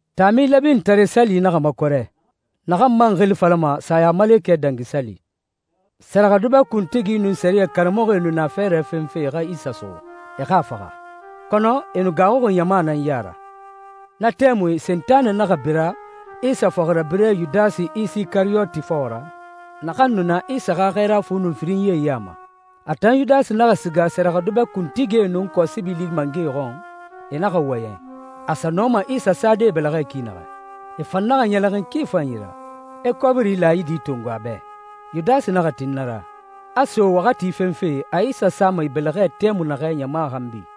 Taami Lɛbinitare Sali naxa makɔrɛ, naxan man xili falama Sayamalekɛ Dangi Sali. Sɛrɛxɛdubɛ kuntigie nun sɛriyɛ karamɔxɔe nu na fɛɛrɛ fenfe e xa Isa suxu, e xa a faxa, kɔnɔ e nu gaaxuxi ɲama nan ya ra. Na tɛmui Sentanɛ naxa bira Isa fɔxirabirɛ Yudasi Isikariyoti fɔxɔ ra, naxan nu na Isa xa xɛɛra fu nun firinyie ya ma. A tan Yudasi naxa siga sɛrɛxɛdubɛ kuntigie nun kɔsibili mangɛe xɔn, e naxa wɔyɛn, a sa nɔma Isa sade e bɛlɛxɛ ki naxɛ. E fan naxa ɲɛlɛxin ki fanyi ra, e kɔbiri laayidi tongo a bɛ. Yudasi naxa tin na ra, a so waxati fenfe a Isa sama e bɛlɛxɛ tɛmui naxɛ ɲama xanbi.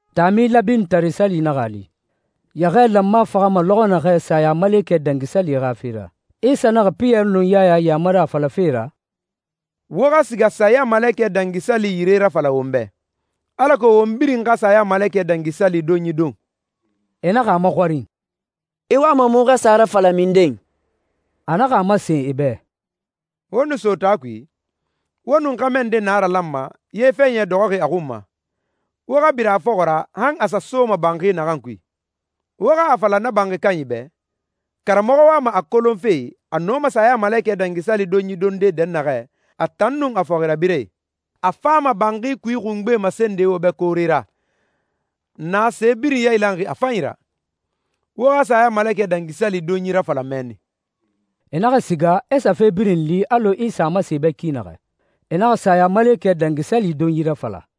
Taami Lɛbinitare Sali naxa a li, yɛxɛɛ lanma faxama lɔxɔ naxɛ Sayamalekɛ Dangi Sali xa fe ra. Isa naxa Piyɛri nun Yaya yamari a falafe ra, «Wo xa siga Sayamalekɛ Dangi Sali yire rafala won bɛ, alako won birin xa Sayamalekɛ Dangi Sali donyi don.» E naxa a maxɔrin, «I wama muxu xa sa a rafala minden?» A naxa a masen e bɛ, «Wo nu so taa kui, wo nun xɛmɛ nde naralanma, ye fɛɲɛ dɔxɔxi a xun ma. Wo xa bira a fɔxɔ ra han a sa soma banxi naxan kui. Wo xa a fala na banxi kanyi bɛ, ‹Karamɔxɔ wama a kolonfe a nɔma Sayamalekɛ Dangi Sali donyi donde dɛnnaxɛ, a tan nun a fɔxirabirɛe.› A fama banxi kui xungbe masende wo bɛ koore ra, na se birin yailanxi a fanyi ra. Wo xa Sayamalekɛ Dangi Sali donyi rafala mɛnni.» E naxa siga, e sa fe birin li alɔ Isa a masen e bɛ ki naxɛ. E naxa Sayamalekɛ Dangi Sali donyi rafala.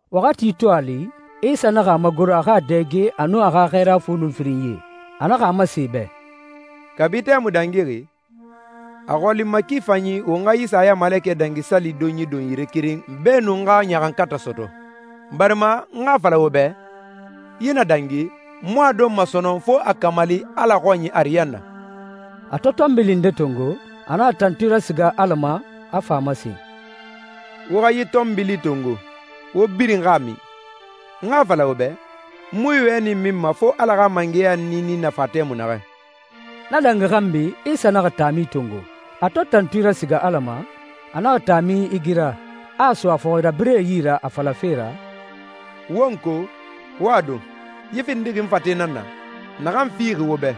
Waxati to a li, Isa naxa a magoro a xa a dɛge e nun a xa xɛɛra fu nun firinyie. A naxa a masen e bɛ, «Kabi tɛmui dangixi, a xɔli n ma ki fanyi won xa yi Sayamalekɛ Dangi Sali donyi don yire keren beenun n xa ɲaxankatɛ sɔtɔ. Barima n xa a fala wo bɛ, yi na dangi, n mu a donma sɔnɔn fo a kamali Ala xɔnyi ariyanna.» A to tɔnbili nde tongo, a naxa tantui rasiga Ala ma, a fa a masen, «Wo xa yi tɔnbili tongo, wo birin xa a min. N xa a fala wo bɛ, n mu yi wɛni minma fo Ala xa mangɛya niini na fa tɛmui naxɛ.» Na dangi xanbi Isa naxa taami tongo. A to tantui rasiga Ala ma, a naxa taami igira, a a so a fɔxirabirɛe yi ra a falafe ra, «Wo n ko, wo a don. Yi findixi n fate nan na, naxan fixi wo bɛ.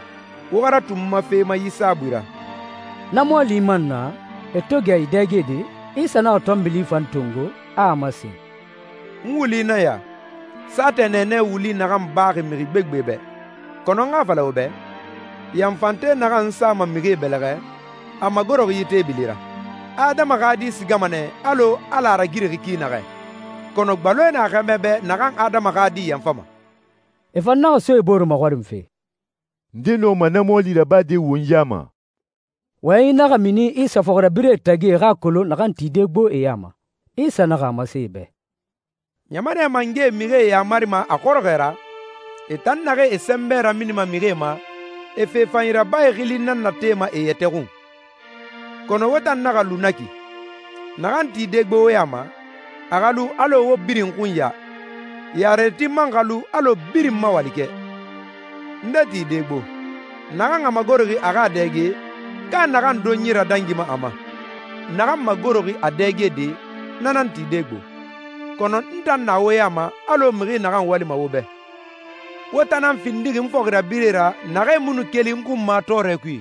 Wo xa ratu n ma fe ma yi saabui ra.» Na mɔɔli man na, e to gɛ e dɛgede, Isa naxa tɔnbili fan tongo, a a masen, «N wuli nan ya, saatɛ nɛɛnɛ wuli naxan baxi mixi gbegbe bɛ. Kɔnɔ n xa a fala wo bɛ, yanfante naxan n sama mixie bɛlɛxɛ, a magoroxi yi teebili ra. Adama xa Di sigama alɔ Ala a ragirixi ki naxɛ, kɔnɔ gbaloe na xɛmɛ bɛ naxan Adama xa Di yanfama.» E fan naxa so e bore maxɔrinfe, «Nde nɔma na mɔɔli rabade won ya ma?» Wɔyɛnyi naxa mini Isa fɔxirabirɛe tagi e xa a kolon naxan tide gbo e ya ma. Isa naxa a masen e bɛ, «Ɲamanɛ mangɛe mixie yamarima a xɔrɔxɔɛ ra. E tan naxee e sɛnbɛ raminima mixie ma, e ‹fe fanyi rabae› xili nan natema e yɛtɛ xun. Kɔnɔ wo tan naxa lu na ki. Naxan tide gbo wo ya ma, a xa lu alɔ wo birin xunya. Yarerati man xa lu alɔ birin ma walikɛ. Nde tide gbo, naxan a magoroxi a xa a dɛge, ka naxan donyi radangima a ma? Naxan magoroxi a dɛgede, na nan tide gbo, kɔnɔ n tan na wo ya ma alɔ mixi naxan walima wo bɛ.» «Wo tan nan findixi n fɔxirabirɛe ra naxee mu nu keli n xun n ma tɔɔrɛ kui.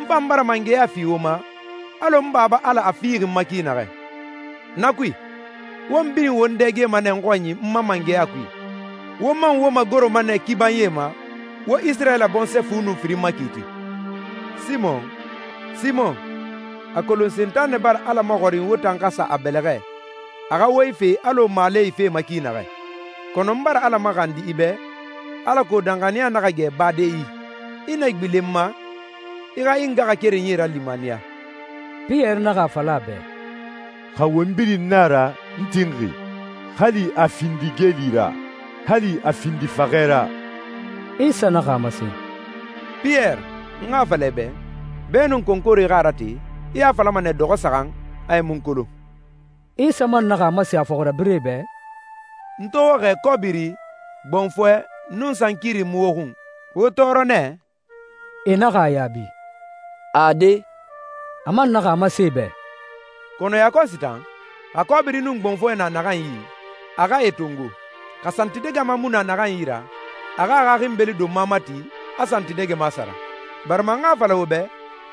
N fan bara mangɛya fi wo ma, alɔ n Baba Ala a fixi n ma ki naxɛ. Na kui, won birin won dɛgema nɛ n xɔnyi n ma mangɛya kui, wo man wo magoroma nɛ kibanyie ma, wo Isirayila bɔnsɔɛ fu nun firin makiiti.» «Simɔn, Simɔn, a kolon Sentanɛ bara Ala maxɔrin wo tan xa sa a bɛlɛxɛ, a xa wo ife alɔ maale ifema ki naxɛ. Kɔnɔ n bara Ala maxandi i bɛ, alako danxaniya naxa gɛ bade i yi. I na gbilen n ma, i xa i ngaxakerenyie ralimaniya.» Piyɛri naxa a fala a bɛ, «Xa won birin nan a ra, n tinxi, hali a findi geeli ra, hali a findi faxɛ ra!» Isa naxa a masen, «Piyɛri, n xa a fala i bɛ, beenun konkore xa a rate, i a falama nɛ dɔxɔ saxan, a i mu n kolon.» Isa man naxa a masen a fɔxirabirɛe bɛ, «N to wo xɛɛ kɔbiri, gbɔnfɔɛ, nun sankiri mu wo xun, wo tɔɔrɔ nɛ?» E naxa a yaabi, «Ade.» A man naxa a masen e bɛ, «Kɔnɔ yakɔsi tan, xa kɔbiri nun gbɔnfɔɛ na naxan yi, a xa e tongo. Xa santidɛgɛma mu na naxan yi ra, a xa a xa xinbeli donma mati, a santidɛgɛma sara, barima n xa a fala wo bɛ,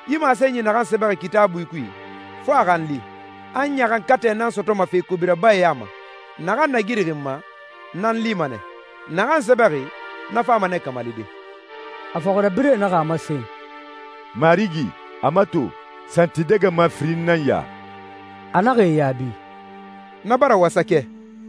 yi masenyi naxan sɛbɛxi Kitaabui kui, fo a xa n li, ‹A ɲaxankatɛ nan sɔtɔma fe kobi rabae ya ma.› Naxan nagirixi n ma, na n lima nɛ. Naxan sɛbɛxi, na fama nɛ kamalide.» A fɔxirabirɛe naxa a masen, «Marigi, a mato, santidɛgɛma firin nan ya.» A naxa e yaabi, «Na bara wasakɛ.»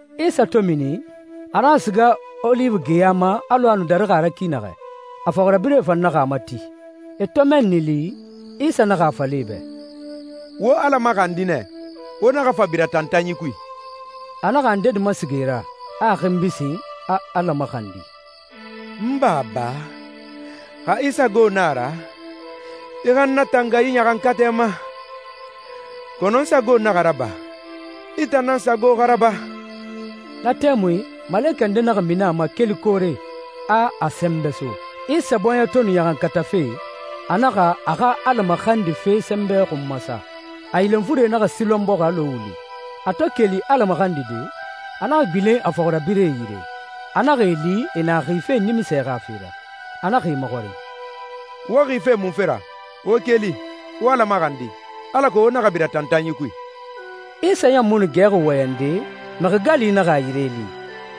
Isa to mini, a naxa siga Oliwi geya ma alɔ a nu darixi a ra ki naxɛ, a fɔxirabirɛe fan naxa a mati. E to mɛnni li, Isa naxa a fala e bɛ, «Wo Ala maxandi nɛ, wo naxa fa bira tantanyi kui.» A naxa a ndedi masiga e ra, a a xinbi sin, a Ala maxandi, «N Baba, xa i sago na a ra, i xa n natanga yi ɲaxankatɛ ma. Kɔnɔ n sago naxa raba, i tan nan sago xa raba.» Na tɛmui malekɛ nde naxa mini a ma keli koore, a a sɛnbɛ so. Isa bɔɲɛ to nu ɲaxankatafe, a naxa a xa Ala maxandife sɛnbɛ xun masa. A yilenfure naxa silɔn bɔxi alɔ wuli. A to keli Ala maxandide, a naxa gbilen a fɔxirabirɛe yire, a naxa e li e na xife nimisɛ xa fe ra. A naxa e maxɔrin, «Wo xife munfe ra? Wo keli, wo Ala maxandi, alako wo naxa bira tantanyi kui.» Isa ɲan mu nu gɛxi wɔyɛnde, mixi gali naxa a yire li.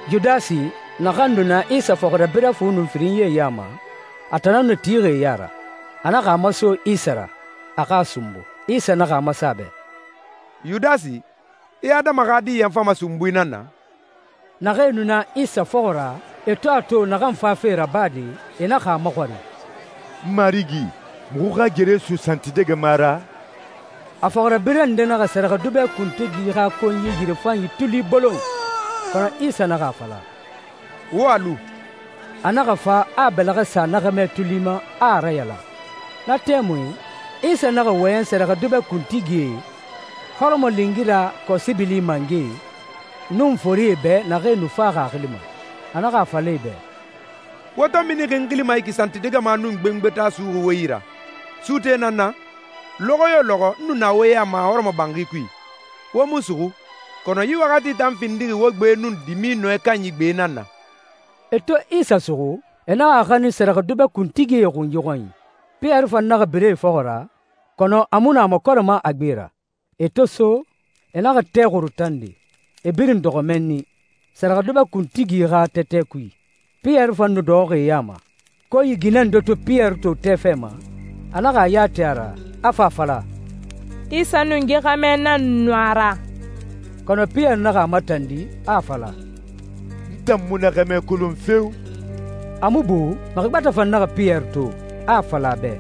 Yudasi, naxan nu na Isa fɔxirabirɛ fu nun firinyie ya ma, a tan nan nu tixi e ya ra. A naxa a maso Isa ra, a xa a sunbu. Isa naxa a masen a bɛ, «Yudasi, i Adama xa Di yanfama sunbui nan na?» Naxee nu na Isa fɔxɔ ra, e to a to naxan fafe rabade, e naxa a maxɔrin, «Marigi, muxu xa gere so santidɛgɛma ra?» A fɔxirabirɛ nde naxa sɛrɛxɛdubɛ kuntigi xa konyi yirefanyi tuli bolon. Kɔnɔ Isa naxa a fala, «Wo a lu!» A naxa fa a bɛlɛxɛ sa na xɛmɛ tuli ma, a a rayalan. Na tɛmui, Isa naxa wɔyɛn sɛrɛxɛdubɛ kuntigie, hɔrɔmɔlingira kɔsibili mangɛe, nun forie bɛ naxee nu faxi a xili ma. A naxa a fala e bɛ, «Wo to minixi n xili ma santidɛgɛma nun gbengbeta suxuxi wo yi ra, suute nan n na? Lɔxɔ yo lɔxɔ n nu na wo ya ma hɔrɔmɔbanxi kui, wo mu n suxu. Kɔnɔ yi waxati tan findixi wo gbe nun dimi nɔɛ kanyi gbe nan na.» E to Isa suxu, e naxa a xanin sɛrɛxɛdubɛ kuntigie xunyi xɔnyi. Piyɛri fan naxa bira e fɔxɔ ra, kɔnɔ a mu nu a makɔrɛma a gbe ra. E to so, e naxa tɛ xuru tande, e birin dɔxɔ mɛnni, sɛrɛxɛdubɛ kuntigi xa tɛtɛ kui. Piyɛri fan nu dɔxɔxi e ya ma. Konyi ginɛ nde to Piyɛri to tɛ fɛ ma, a naxa a ya ti a ra, a fa a fala, «Isa nun yi xɛmɛ nan nu a ra.» Kɔnɔ Piyɛri naxa a matandi, a a fala, «N tan mu na xɛmɛ kolon feo!» A mu bu, mixi gbɛtɛ fan naxa Piyɛri to, a a fala a bɛ,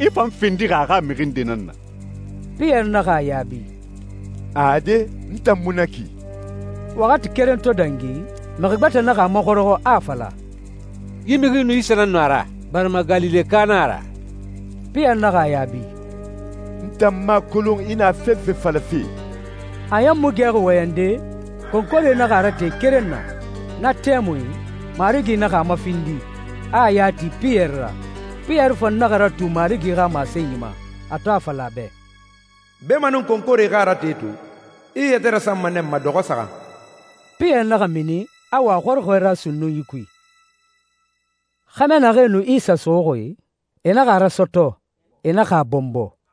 «I fan findixi a xa mixi nde nan na.» Piyɛri naxa a yaabi, «Ade, n tan mu na ki!» Waxati keren to dangi, mixi gbɛtɛ naxa a maxɔrɔxɔ, a a fala, «Yi mixi nun Isa nan nu a ra, barima Galileka nan a ra.» Piyɛri naxa a yaabi, «N tan mu a kolon i na fefe falafe!» A ɲan mu nu gɛxi wɔyɛnde, konkore naxa a rate keren na. Na tɛmui, Marigi naxa a mafindi, a a ya ti Piyɛri ra. Piyɛri fan naxa ratu Marigi xa masenyi ma, a to a fala a bɛ, «Beemanun konkore xa a rate to, i i yɛtɛ rasanma nɛ n ma dɔxɔ saxan.» Piyɛri naxa mini, a wa a xɔrɔxɔɛ ra sunnunyi kui. Xɛmɛ naxee nu Isa suxuxi, e naxa a rasɔtɔ, e naxa a bɔnbɔ.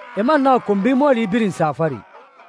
E man naxa konbi mɔɔli birin sa a fari.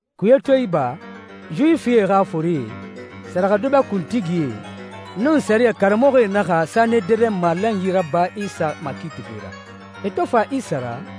Kuye to iba, Yuwifie xa forie, sɛrɛxɛdubɛ kuntigie, nun sɛriyɛ karamɔxɔe naxa Sanederɛn malanyi raba Isa makiitife ra. E to fa Isa ra,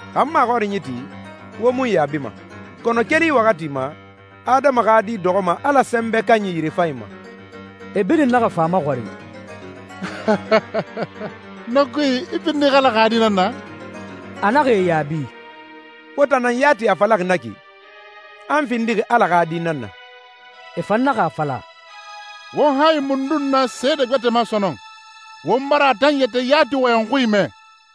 Xa n maxɔrinyi ti, wo mu n yaabima. Kɔnɔ keli yi waxati ma, Adama xa Di dɔxɔma Ala Sɛnbɛ Kanyi yirefanyi ma.» E birin naxa fa a maxɔrin, «Na kui, i findixi Ala xa Di nan na?» A naxa e yaabi, «Wo tan nan yati a falaxi na ki, a n findixi Ala xa Di nan na.» E fan naxa a fala, «Won hayi mundun na seede gbɛtɛ ma sɔnɔn? Won bara a tan yɛtɛ yati wɔyɛn xui mɛ.»